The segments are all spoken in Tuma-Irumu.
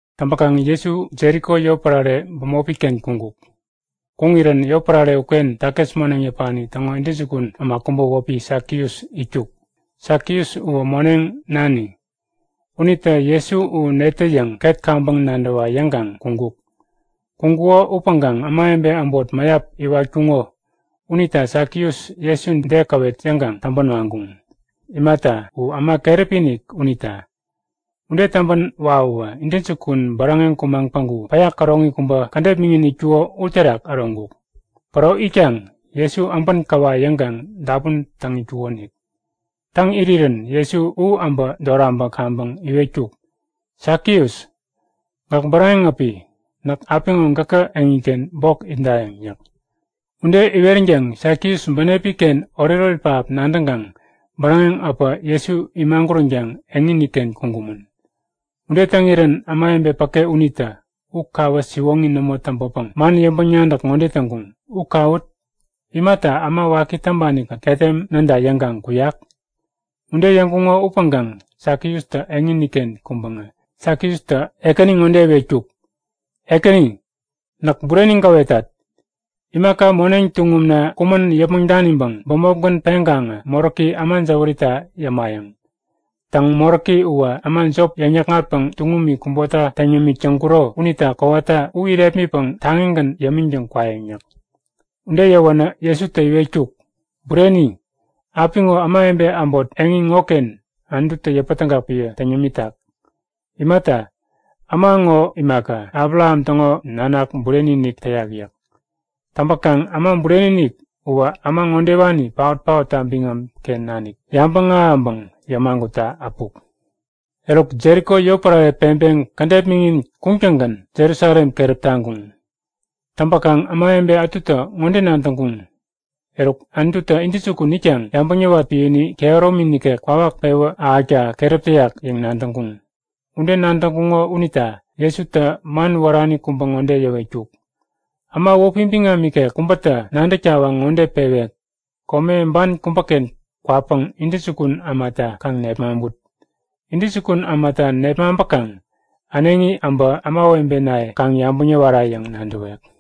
Täŋpäkaŋ Jesu Jeriko yotpärare bämopi-ken kuŋkuk. Kuŋirän yotpärare uken takis moneŋ yäpani täŋo intäjukun äma kubä wäpi Sakius itkuk. Sakius uwä moneŋ nani. Unitä Jesu u netä yäŋ ket kaŋpäŋ nadäwa yäŋkaŋ kuŋkuk. Kuŋkuko upäŋkaŋ ämawebe äbot mäyap iwatkuŋo unita Sakius Jesu detäde käwet yäŋkaŋ täŋpän waŋkuŋ. Imata, u äma keräpi-inik unita. Ude täŋpän wawäwä intäjukun bäräŋeŋ kumaŋ päŋku päya käroŋi kubä kädet miŋin itkuko uterak äroŋkuk. Päro itkaŋ Jesu äbän käwayäŋ yäŋkaŋ dapun täŋ itkukonik. Täŋ irirän Jesu u äbä doraŋpäŋ kaŋpäŋ iwetkuk; Sakius! Gäk bäräŋeŋ äpi. Näk apiŋo gäkä eŋiken bok itdayäŋ yäk. Ude iweränkaŋ Sakius bänepi-ken oretoret pähap nadäŋkaŋ bäräŋeŋ äpä Jesu imaguränkaŋ eŋini-ken kuŋkumän. Ude täŋirän ämawebe päke unitä u kawä siwoŋi nämo täŋpäpäŋ man yäŋpäŋ-nadäk ŋode täŋkuŋ; U kawut! Imata äma waki täŋpani-kät ketem näda yäŋkaŋ kuyak? Ude yäŋkuŋo upäŋkaŋ Sakiustä eŋiniken kuŋpäŋä Sakiustä Ekäni ŋode iwetkuk; Ekäni näk bureni gäwetat. Imaka moneŋ tuŋumna kumän yäpmäŋ daniŋpäŋ bämopgän peŋkaŋä moräki äma jäwärita yämayäŋ. Täŋ, moräki uwä äma jop yäŋ-yäkŋatpäŋ tuŋumi kubota täŋ yämik täŋkuro unita kowata u irepmitpäŋ taŋigän yämiŋtäŋ kwayäŋ yäk. Ude yäwänä Jesutä iwetkuk; Bureni! Apiŋo ämawebe äbot eŋi ŋoken Anututä yäpätägak piä täŋ yämitak. Imata, äma ŋo imaka, Abraham täŋo nanak bureni-inik täyak yäk. Täŋpäkaŋ Äma Bureni-inik uwä äma ŋodewani paot-paotta biŋam-ken nanik yabäŋ ahäŋpäŋ yämagutta äpuk. Eruk, Jeriko yotpärare peŋpeŋ kädet miŋin kuŋtäŋgän Jerusalem keräp taŋkuŋ. Täŋpäkaŋ ämawebe ätutä ŋode nadäŋkuŋ; Eruk, Anututä intäjukun itkaŋ yabäŋ yäwat piäni kehäromi nikek kwawak pewä ahäkta keräp täyak yäŋ nadäŋkuŋ. Ude nadäŋkuŋo unita Jesutä man wärani kubä ŋode yäwetkuk; Äma wäpi biŋam ikek kubätä nadäk tawaŋ ŋode pewek; Kome ban kubäken kwapäŋ intäjukun ämata kaŋ nepmaŋput. Intäjukun ämata nepmaŋpäkaŋ äneŋi äbä ämawebenaye kaŋ yabäŋ yäwara yäŋ nadäwek.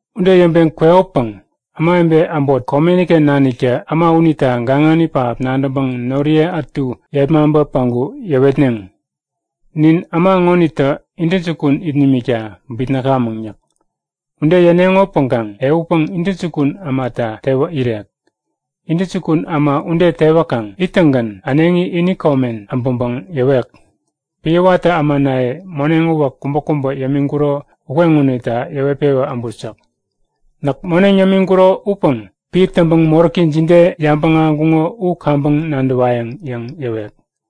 Ude yäŋpeŋ kwekopäŋ ämawebe äbot komeni-ken naniktä äma unita gaŋani pähap nadäŋpäŋ noriye ätu yepmaŋpä päŋku yäwetneŋ; Nin äma ŋonitä intäjukun it nimikta bitnäkamäŋ yäk. Ude yäneŋopäŋkaŋ ehutpäŋ intäjukun ämata tewä irek. Intäjukun äma ude tewäkaŋ ittäŋgän äneŋi ini komen äbäŋpäŋ yäwek; Piä watä ämanaye moneŋ uwäk kubäkubä yämiŋkuro ukeŋonita yäŋpewä äbut yäk. Näk moneŋ yämiŋkuro upäŋ piä täŋpäŋ moräki jide yabäŋ ahäŋkuŋo u kaŋpäŋ nadäwayäŋ yäŋ yäwek.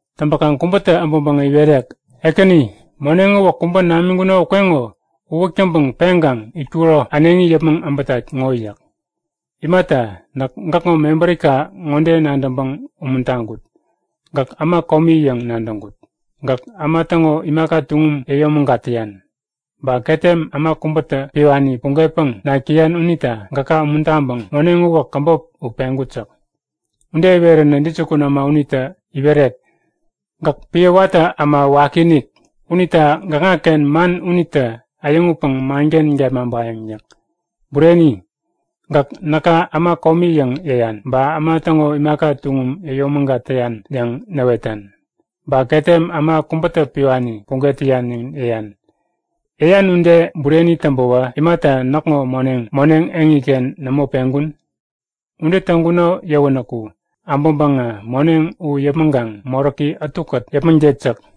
Täŋpäkaŋ kubätä äbäŋpäŋä iwerek; Ekäni, moneŋ uwäk kubä namiŋkuno ukeŋo uwäk täŋpäŋ peŋkaŋ itkuko äneŋi yäpmäŋ äbätat ŋo yäk. Imata, näk gäkŋo mebärika ŋode nadäŋpäŋ umuntaŋkut; Gäk äma komi yäŋ nadäŋkut. Gäk äma täŋo imaka tuŋum yäyomägat täyan. Ba ketem äma kubätä piwani pugetpäŋ nak täyan unita gäka umuntaŋpäŋ moneŋ uwäk käbop u peŋkut yäk. Ude iweränä intäjukun äma unitä iwerek; Gäk piä watä äma wakiinik! Unita gäkŋaken man unitä äyäŋutpäŋ manken gepmaŋpayäŋ yäk. Bureni! Gäk näka äma komi yäŋ yäyan. Ba äma täŋo imaka tuŋum yäyomägat täyan yäŋ näwetan. Ba ketem äma kubätä piwani puget täyan yäŋ yäyan. Yäyan ude bureni täŋpäwä imata näkŋo moneŋ, moneŋ eŋiken nämo peŋkun? Ude täŋkuno yäwänäku äbäŋpäŋä moneŋ u yäpmäŋkaŋ moräki ätukät yäpmäŋtet yäk.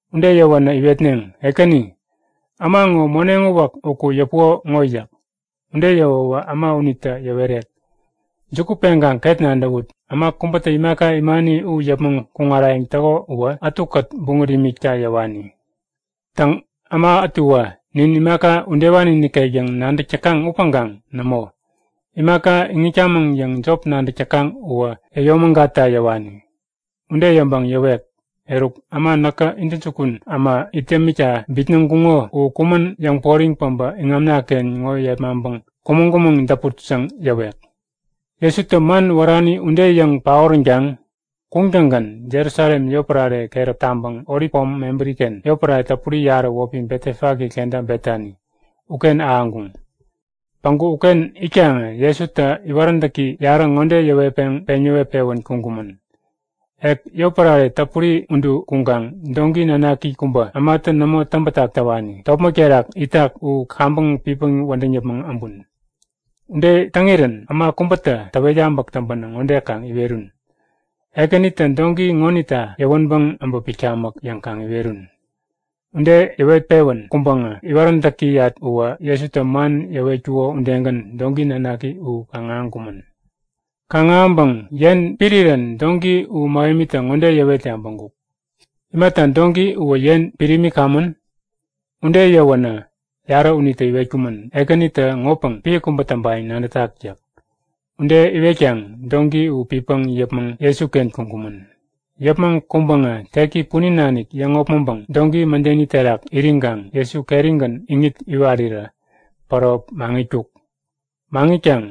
Ude yäwänä iwetneŋ; Ekäni! Äma ŋo moneŋ uwäk uku yäpuko ŋo yäk. Ude yäwäwä äma unitä yäwerek; Juku peŋkaŋ ket nadäwut! Äma kubätä imaka imani u yäpmäŋ kuŋarayäŋ täko uwä ätukät buŋät imikta yäwani. Täŋ, äma ätuwä nin imaka udewani nikek yäŋ nadäk täkaŋ upäŋkaŋ nämo! Imaka iŋitkamäŋ yäŋ jop nadäk täkaŋ uwä yäyomägatta yäwani. Ude yäŋpäŋ yäwek; Eruk, äma näkä intäjukun äma it yämikta bitnäŋkuŋo u kumän yäŋporiŋ päbä iŋamna-ken ŋo yepmaŋpäŋ kumäŋ-kumäŋ däput yäŋ yäwek. Jesutä man wärani ude yäŋ paoränkaŋ kuŋtäŋgän Jerusalem yotpärare keräp taŋpäŋ Olip pom mebäri-ken yotpärare täpuri yarä wäpi Betefage kenta Betani uken ahäŋkuŋ. Päŋku uken itkaŋä Jesutä iwaräntäki yarä ŋode yäwetpäŋ peŋ yäwet-pewän kuŋkumän; Ek yotpärare täpuri udu kuŋkaŋ doŋki nanaki kubä, ämatä nämo täŋbätak täwani, topmäk terak itak u kaŋpäŋ pitpäŋ wädäŋ yäpmäŋ äbun. Ude täŋirän äma kubätä täwet yabäk täŋpänä ŋode kaŋ iwerun; Ekänitä doŋki ŋonita yäwänpäŋ äbä pitkamäk yäŋ kaŋ iwerun. Ude yäwet-pewän kuŋpäŋä iwaräntäkiyat uwä Jesutä man yäwetkuko udegän doŋki nanaki u kaŋ-ahäŋkumän. Kaŋ-ahäŋpäŋ yen pit irirän doŋki u mähemitä ŋode yäwet yabäŋkuk; Imata doŋki uwä yen pit imikamän? Ude yäwänä yarä unitä iwetkumän; Ekänitä ŋopäŋ piä kubä täŋpayäŋ nadätak yäk. Ude iwetkaŋ doŋki u pitpäŋ yäpmäŋ Jesuken kuŋkumän. Yäpmäŋ kuŋpäŋä teki punin nanik yäŋopmäŋpäŋ doŋki mädeni terak iriŋkaŋ Jesu kerigän iŋit iwarirä päro maŋitkuk. Maŋitkaŋ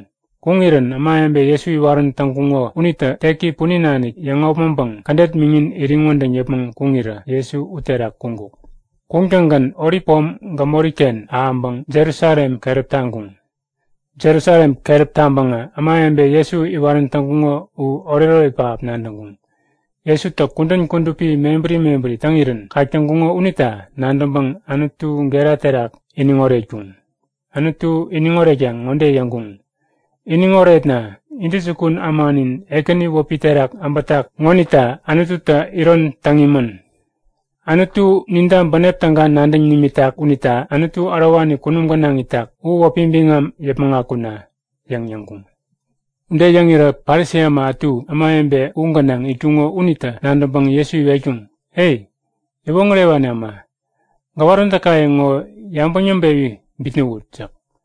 kuŋirän ämawebe Jesu iwarän täŋkuŋo unitä teki punin nanik yäŋopmäŋpäŋ kädet miŋin iriŋ wädäŋ yäpmäŋ kuŋirä Jesu uterak kuŋkuk. Kuŋtäŋgän Olip pom gämori-ken ahäŋpäŋ Jerusalem keräp taŋkuŋ. Jerusalem keräp taŋpäŋä ämawebe Jesu iwarän täŋkuŋo u oretoret pähap nadäŋkuŋ. Jesutä kudän kudupi mebäri mebäri täŋirän kak täŋkuŋo unita nadäŋpäŋ Anutu gera terak iniŋ oretkuŋ. Anutu iniŋ oretkaŋ ŋode yäŋkuŋ; Iniŋ oretna! Intäjukun ämanin Ekäni wäpi terak äbätak ŋonita Anututä iron täŋ imän! Anutu ninta bänep täga nadäŋ nimitak unita Anutu ärowani kunum gänaŋ itak u wäpi biŋam yäpmäŋ akuna! yäŋ yäŋkuŋ. Ude yäŋirä Parisi äma ätu ämawebe u gänaŋ itkuŋo unitä nadäŋpäŋ Jesu iwetkuŋ; E! Yäwoŋärewani äma! Gäwaräntäkaye ŋo yabäŋ yäŋpewi bitnäwut! yäk.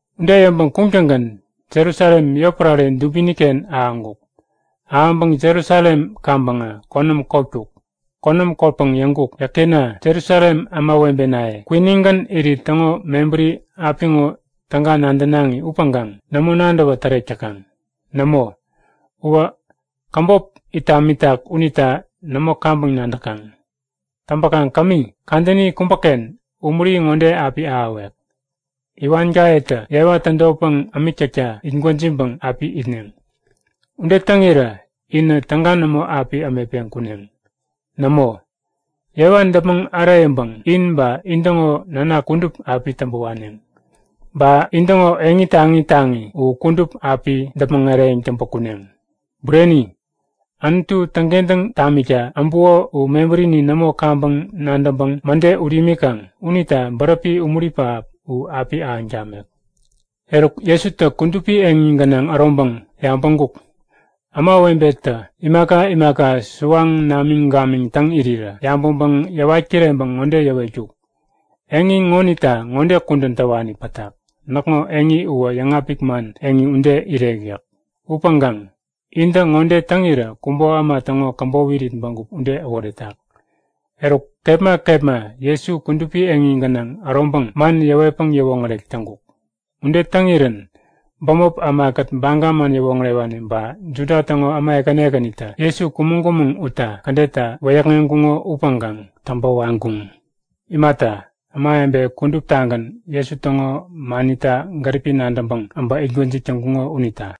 Ude yäŋpäŋ kuŋtäŋgän Jerusalem yotpärare dubiniken ahäŋkuk. Ahäŋpäŋ Jerusalem kaŋpäŋä konäm kotkuk. Konäm kotpäŋ yäŋkuk; Yäkena! Jerusalem ämawebenaye! Kwinigän irit täŋo mebäri apiŋo täga nadänaŋi upäŋkaŋ nämo nadäwä tärek täkaŋ. Nämo, uwä käbop it tamitak unita nämo kaŋpäŋ nadäkaŋ. Täŋpäkaŋ kämi, kadäni kubäken umuri ŋode api ahäwek; Iwankayetä yewa tädotpäŋ ämik täkta it gwäjiŋpäŋ api itneŋ. Ude täŋirä inä täga nämo api ämetpeŋ kuneŋ. Nämo! Yewa däpmäŋ äreyäŋpäŋ in ba intäŋo nanak kudup api täŋpä waneŋ. Ba intäŋo eŋi taŋi taŋi u kudup api däpmäŋ eräŋ täŋpä kuneŋ. Bureni! Anutu täŋkentäŋ tamikta äbuko u mebärini nämo kaŋpäŋ nadäŋpäŋ mäde ut imikaŋ unita bäräpi umuri pähap u api ahäŋ tamek. Eruk, Jesutä kudupi eŋi gänaŋ äroŋpäŋ yabäŋkuk; Ämawebetä imaka imaka suwaŋ namiŋ gamiŋ täŋ irirä. Yabäŋpäŋ yäwat kireŋpäŋ ŋode yäwetkuk; Eŋi ŋonita ŋode kudän täwani pätak; Näkŋo eŋi uwä yäŋapik man eŋi ude irek yäk. Upäŋkaŋ intä ŋode täŋirä kubo äma täŋo käbop irit bägup ude äworetak. Eruk kepma kepma Jesu kudupi eŋi gänaŋ äroŋpäŋ man yäwetpäŋ yäwoŋärek täŋkuk. Ude täŋirän bämop ämakät Baga man yäwoŋärewani ba Juda täŋo äma ekäni ekänitä Jesu kumäŋ-kumäŋ utta kädetta wäyäkŋeŋkuŋo upäŋkaŋ täŋpä waŋkuŋ. Imata, ämawebe kuduptagän Jesu täŋo manita gäripi nadäŋpäŋ äbä itgwäjik täŋkuŋo unita.